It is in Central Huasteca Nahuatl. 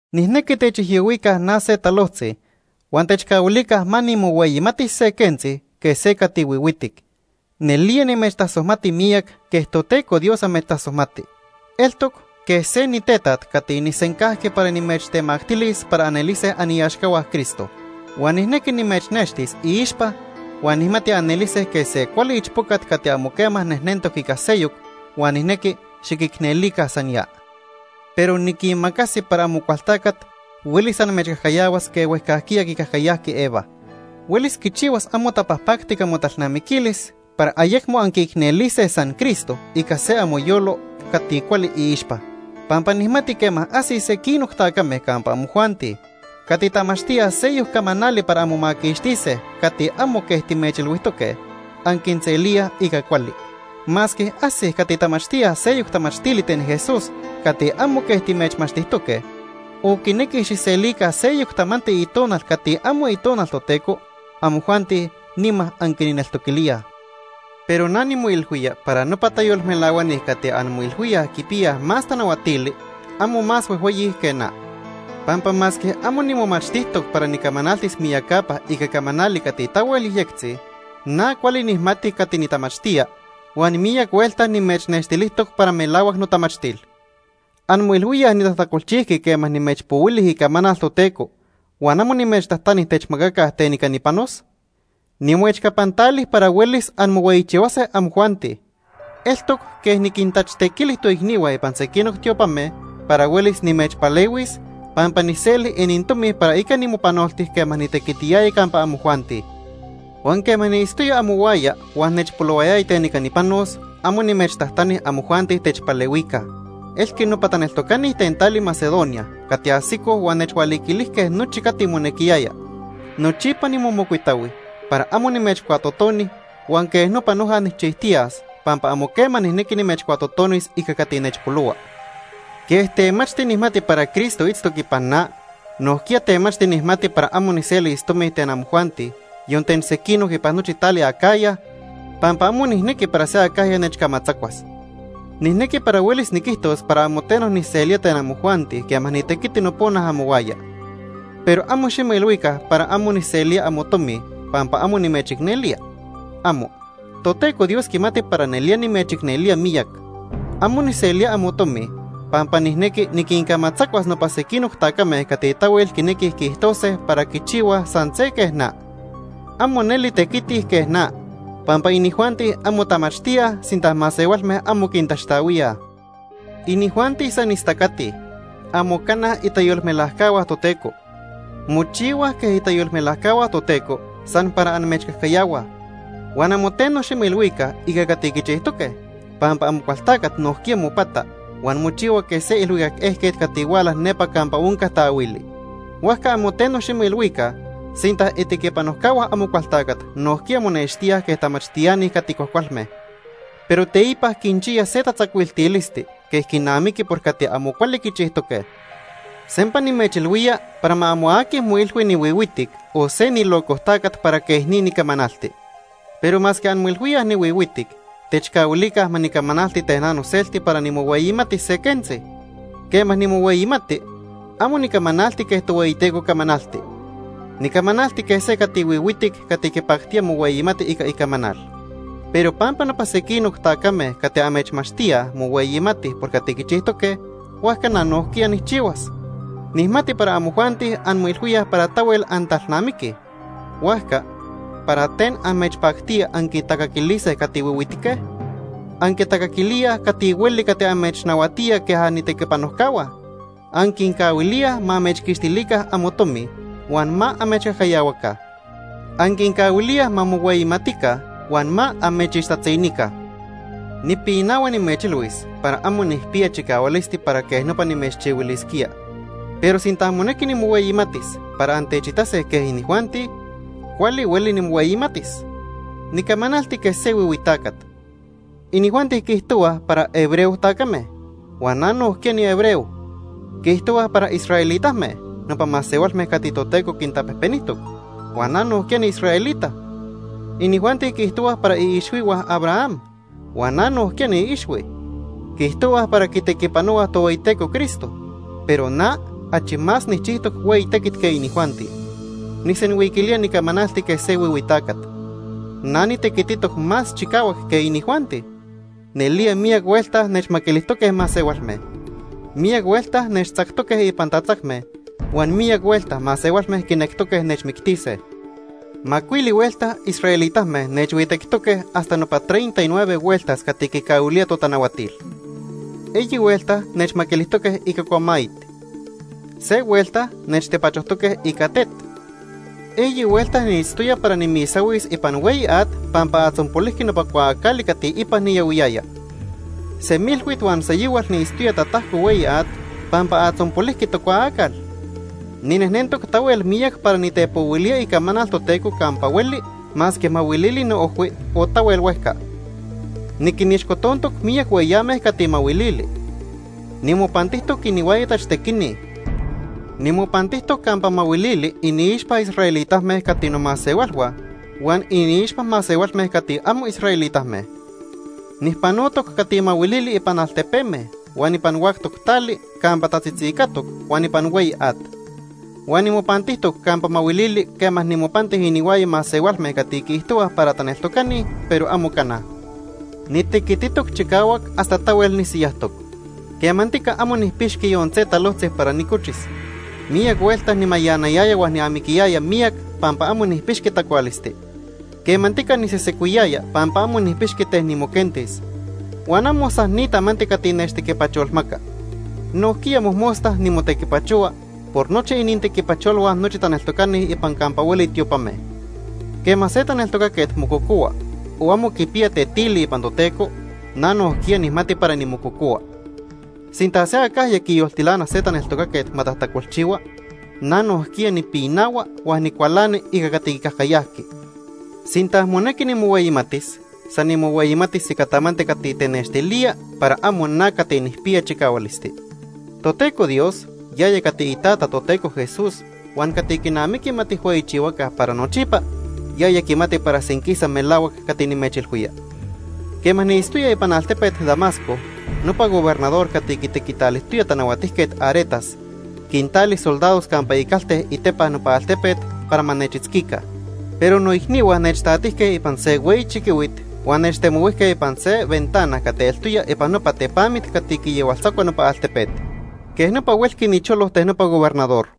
Nijnequi techijyohuica na se talojtzi huan techcahuilica ma nimohueyimatis se quentzi quej se cati huihuitic. Nelía nimechtasojmati miyac quej Toteco Dios amechtasojmati. Eltoc quej se nitetaj cati nijsencajqui para nimechtemactilis para anelise aniaxcahua Cristo. Huan nijnequi nimechnextis iixpa huan nijmati anelise quej se cuali ichpocat cati amo quema nejnentoc ica seyoc, huan nijnequi xiquicnelica san ya. Pero niquimacasi para Amocualtacat huelis amechcajcayahuas quej huejcajquiya quicajcayajqui Eva. Huelis quichihuas amo tapajpactic amotalnamiquilis para ayecmo anquiicnelise san Cristo ica se amoyolo cati cuali iixpa. Pampa nijmati quema ajsij sequinoc tacame campa amojuanti cati tamachtíaj seyoc camanali para anmomaquixtise cati amo quej timechilhuijtoque, anquinselíaj ica cuali. Masque ajsij cati tamachtíaj seyoc tamachtili ten Jesús cati amo quej timechmachtijtoque, o quinequij xijselica seyoc tamanti itonal cati amo Itonal Toteco, amojuanti nima anquinneltoquilíaj. Pero na nimoilhuía para nopa tayolmelahuani cati anmoilhuíaj quipiyaj más tanahuatili, amo más huejhueyi que na. Pampa masque amo nimomachtijtoc para nicamanaltis miyacapa ica camanali cati tahuel yejyectzi, na cuali nijmati cati nitamachtía, huan miyac huelta nimechnextilijtoc para melahuac notamachtil. ¿Anmoilhuíaj nitajtacolchijqui quema nimechpohuili icamanal Toteco huan amo nimechtajtani techmacaca ten ica nipanos? Nimoechcapantali para huelis anmohueyichihuase amojuanti. Eltoc quej “niquintachtequili” toicnihua ipan sequinoc tiopame para huelis nimechpalehuis, pampa nijseli inintomi para ica nimopanolti quema nitequitiyaya campa amojuanti. Huan quema niitztoya amohuaya huan nechpolohuayaya ten ica nipanos, amo nimechtajtani amojuanti techpalehuica. Elqui nopa taneltocani ten tali Macedonia cati ajsicoj huan nechhualiquilijque nochi cati monequiyaya. Nochipa nimomocuitahui para amo nimechcuatotoni huan quej nopa noja nijchijtiyas pampa amo quema nijnequi nimechcuatotonis ica cati nechpolohua. Quej temachti nijmati para Cristo itztoc ipan na, nojquiya temachti nijmati para amo nijselis tomi ten amojuanti, yon ten sequinoc ipan nochi tali Acaya, pampa amo nijnequi para se acajya nechcamatzacuas. Nijnequi para huelis niquijtos para amo teno nijselía ten amojuanti quema nitequiti nopona amohuaya. Pero amo ximoilhuica para amo nijselía amotomi pampa amo nimechicnelía. ¡Amo! Toteco Dios quimati para nelía nimechicnelía miyac. Amo nijselía amotomi pampa nijnequi niquincamatzacuas nopa sequinoc tacame cati tahuel quinequij quiijtose para quichihuaj san se quej na. Amo neli tequitij quej na, pampa inijuanti amo tamachtíaj sinta masehualme amo quintaxtahuíaj. Inijuanti san istacatij. Amo cana itayolmelajcahua Toteco. Mochihuaj quej itayolmelajcahua Toteco san para amechcajcayahuaj. Huan amo teno ximoilhuica ica cati quichijtoque, pampa Amocualtacat nojquiya mopata huan mochihua quej se ilhuicac ejquet cati huala nepa campa onca taahuili. Huajca amo teno ximoilhuica sinta itequipanojcahua Amocualtacat nojquiya monextíaj quej tamachtiani cati cuajcualme. Pero teipa quinchiya se tatzacuiltilisti quej quinamiqui por cati amo cuali quichijtoque. Sempa nimechilhuía para ma amo aqui moilhui nihuihuitic o se nilocojtacat para quej ni nicamanalti. Pero masque anmoilhuíaj nihuihuitic, techcahuilica ma nicamanalti ten na noselti para nimohueyimatis se quentzi. Quema nimohueyimati, amo nicamanalti quej Tohueyiteco camanalti. Nicamanalti quej se cati huihuitic cati quipactía mohueyimati ica icamanal. Pero pampa nopa sequinoc tacame cati amechmachtíaj mohueyimatij por cati quichijtoque, huajca na nojquiya nijchihuas. Nijmati para amojuanti anmoilhuíaj para tahuel antalnamiquij, huajca ¿para ten amechpactía anquintacaquilise cati huihuitique? Anquitacaquilíaj cati hueli cati amechnahuatía quej anitequipanojcahua. Anquincahuilíaj ma amechquixtilica amotomi huan ma amechcajcayahuaca. Anquincahuilíaj ma mohueyimatica huan ma amechixtatzinica. Nipinahua nimechilhuis para amo nijpiya chicahualisti para quej nopa nimechchihuilisquía. Pero sinta monequi nimohueyimatis para antechitase quej inijuanti, cuali hueli nimohueyimatis. (Nicamanalti quej se huihui tacat.) Inijuanti quiijtohuaj para hebreo tacame, huan na nojquiya nihebreo. Quiijtohuaj para israelitame, nopa masehualme cati Toteco quintapejpenijtoc, huan na nojquiya niisraelita. Inijuanti quiijtohuaj para iixhuihua Abraham, huan na nojquiya niiixhui. Quiijtohuaj para quitequipanohuaj Tohueyiteco Cristo, pero na achi más nijchijtoc hueyi tequit que inijuanti. (Nijsenhuiquilía nicamanalti quej se huihui tacat.) Na nitequititoc más chicahuac que inijuanti. Nelía miyac huelta nechmaquilijtoque masehualme. Miyac huelta nechtzactoque ipan tatzacme, huan miyac huelta masehualme quinectoque nechmictise. Macuili huelta israelitame nechhuijhuitectoque hasta nopa treinta y nueve hueltas cati quicahuilía totanahuatil. Eyi huelta nechmajmaquilijtoque ica cuamayit. Se huelta nechtepachojque ica tet. Eyi huelta niitztoya para nimisahuis ipan hueyi at pampa atzonpolijqui nopa cuaacali cati ipan niyahuiyaya. Semilhuit huan seyohual niitztoya tatajco hueyi at pampa atzonpolijqui tocuaacal. Ninejnentoc tahuel miyac para nitepohuilía icamanal Toteco campa hueli masque mahuilili noojhui o tahuel huejca. Niquinixcotontoc miyac hueyame cati mahuilili. Nimopantijtoc inihuaya tachtequini. Nimopantijtoc campa mahuilili iniixpa israelitame cati nomasehualhua huan iniixpa masehualme cati amo israelitame. Nijpanotoc cati mahuilili ipan altepeme, huan ipan huactoc tali campa tatzitzicatoc, huan ipan hueyi at. Huan nimopantijtoc campa mahuilili quema nimopanti inihuaya masehualme cati quiijtohuaj para taneltocani, pero amo cana. Nitequititoc chicahuac hasta tahuel nisiyajtoc. Quemantica amo nijpixqui yon se talojtzi para nicochis. Miyac huelta nimayanayaya huan niamiquiyaya miyac pampa amo nijpixqui tacualisti. Quemantica nisesecuiyaya pampa amo nijpixqui ten nimoquentis. Huan amo san ni tamanti cati nechtequipacholmaca, nojquiya mojmosta nimotequipachohua por nochi inintequipacholhua nochi taneltocani ipan campa hueli tiopame. Quema se taneltocaquet mococohua o amo quipiya tetili ipan Toteco, na nojquiya nijmati para nimococohua. Sinta se acajya quiyoltilana se taneltocaquet ma tajtacolchihua, na nojquiya nipinahua huan nicualani ica cati quicajcayajqui. Sinta monequi nimohueyimatis, san nimohueyimatis ica tamanti cati tenextilía para amo na cati nijpiya chicahualisti. Toteco Dios, yaya cati iTata Toteco Jesús huan cati quinamiqui ma tijhueyichihuaca para nochipa, yaya quimati para senquisa melahuac cati nimechilhuía. Quema niitztoya ipan altepet Damasco, nopa gobernador cati quitequitalijtoya Tanahuatijquet Aretas, quintali soldados campa icalte itepa nopa altepet para ma nechitzquica. Pero noicnihua nechtatijque ipan se hueyi chiquihuit huan nechtemohuijque ipan se ventana cati eltoya ipan nopa tepamit cati quiyahualtzacua nopa altepet. Quej nopa huelqui nicholo ten nopa gobernador.